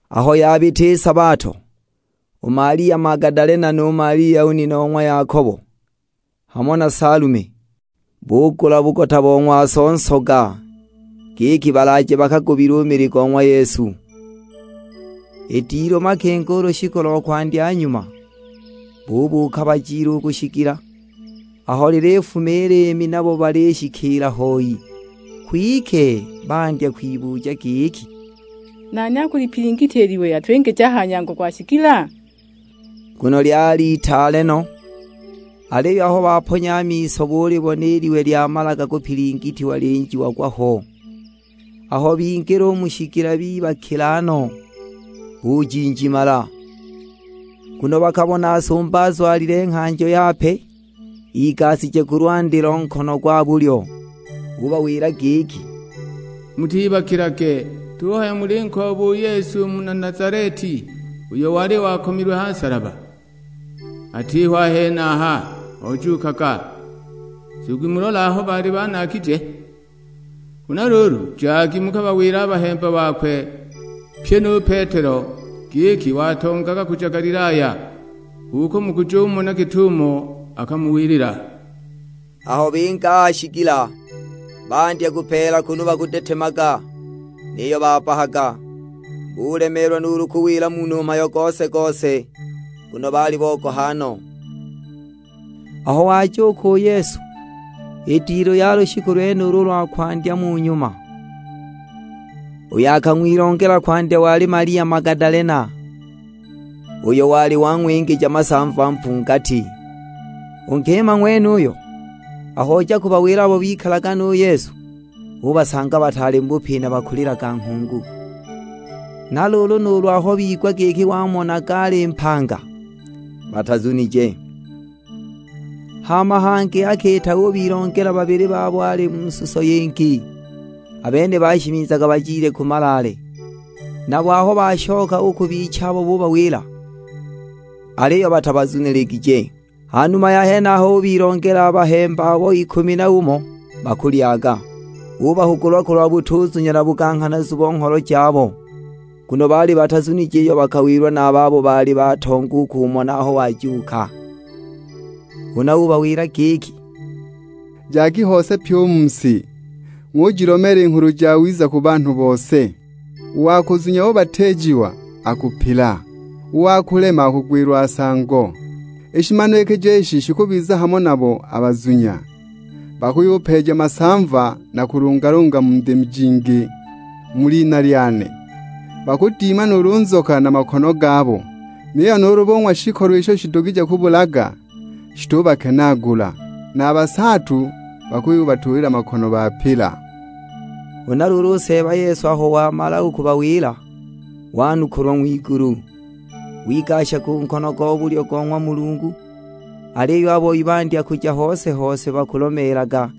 Aho yabita i sabato, u Malia Magadalena nu Malia u nina o ng'wa Yakobo, hamo na Salume, bugula bugota bo ng'waso nsoga, giki balaaje bakagubile u mili go ng'wa Yesu. I dilu makingo u lushiku lo kwandya nyuma, bubuuka bajile u ku shigila. Aho lilifuma i liimi nabo balishikiila hoi. Kwike bandya kwibuja giki, "Nani akulipilingitya i liwe, atwingije a ha nyango go shigila?" Nguno lyali itaale no! Aliyo aho baponya a miso, bulibona i liwe lyamalaga kupilingitiwa lyinjiagwa ho. Aho bingila u mu shigila bibakila no, bujinjimala. Nguno bakabona sumba azwalile nghanjo yape, igashije ku lwandi lo nkono gwa bulyo. Ubawila giki, "Mutibakilage, tuhaya mulinkooba Yesu u muna Nazaleti uyo wali wakomilwe ha nsalaba! Atiho a henaha, ojuukaga. Nzugi mulole aho baali banaagije. Huna luulu, jagi mukabawile a bahemba bakwe, pyi nu Petelo; giki watongaga kuja Galilaya, h'uko mukujumona git'umo akamuwilila!" Aho binga a ha shigila, bandya kupeela kunu bakudetemaga, niyo babbahaga. Bulemeelwa nuulu kuwila munhu mhayo gose-gose, nguno baali bogoha no! [ Aho wajuuka u Yesu, i dilu ya lushiku lwenulo u lwa kwandya mu nyuma, uyo akang'wilongela kwandya wali Malia Magadalena, uyo wali wang'wingija masamva mpungati. U nkima ng'wenuyo, aho oja kubawila abo bikalaga nu Yesu, ubasanga bataali mu bupina bakulilaga nghungu. Na luulu nuulu aho bigwa giki wamonaga ali mpanga, batazunije. Hama hangi akiita ubilongela babili babo ali mu suso yingi, a bene bashimizaga bajile ku malaale. Nabo aho bashoka u ku bichabo bubawila, aliyo batabazuniligije. Ha numa ya henaho ubilongela a bahemba abo ikumi na umo, bakulyaga. Ubahugula kulwa butuzunya na buganghanazu bo ngholo jabo. Nguno baali batazunije iyo bakawilwa na a babo baali batonga u kumona aho wajuuka. Huna ubawila giki, "Jagi hose pyi u mu si, ng'ujilomeela i Nghulu Jawiza ku banhu bose. U wa kuzunya ubatiijiwa akupila, u wa kulema akugwilwa nsango. I shimanikijo ishi shikubiza hamo nabo a bazunya: bakuyupeeja masamva na kulungalunga mu ndimi jingi, mu lina lyane. Bakudima nuulu nzoka na makono gabo, niyo nuulu bung'wa shikolo isho shidugije kubulaga, shitubakenaagula. Na a basaatu bakuyubatuulila makono bapila." Huna luulu u Seeba Yesu aho wamala u kubawila, wanukulwa ng'wigulu. Wigasha ku nkono go bulyo go ng'wa Mulungu. Aliyo a boi bandya kuja hose-hose bakulomeelaga,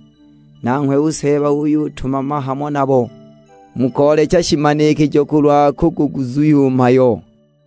nanghwe u Seeba uyutumama hamo nabo, mu koolecha shimanikijo kulwa kuguguzuhya u mhayo.]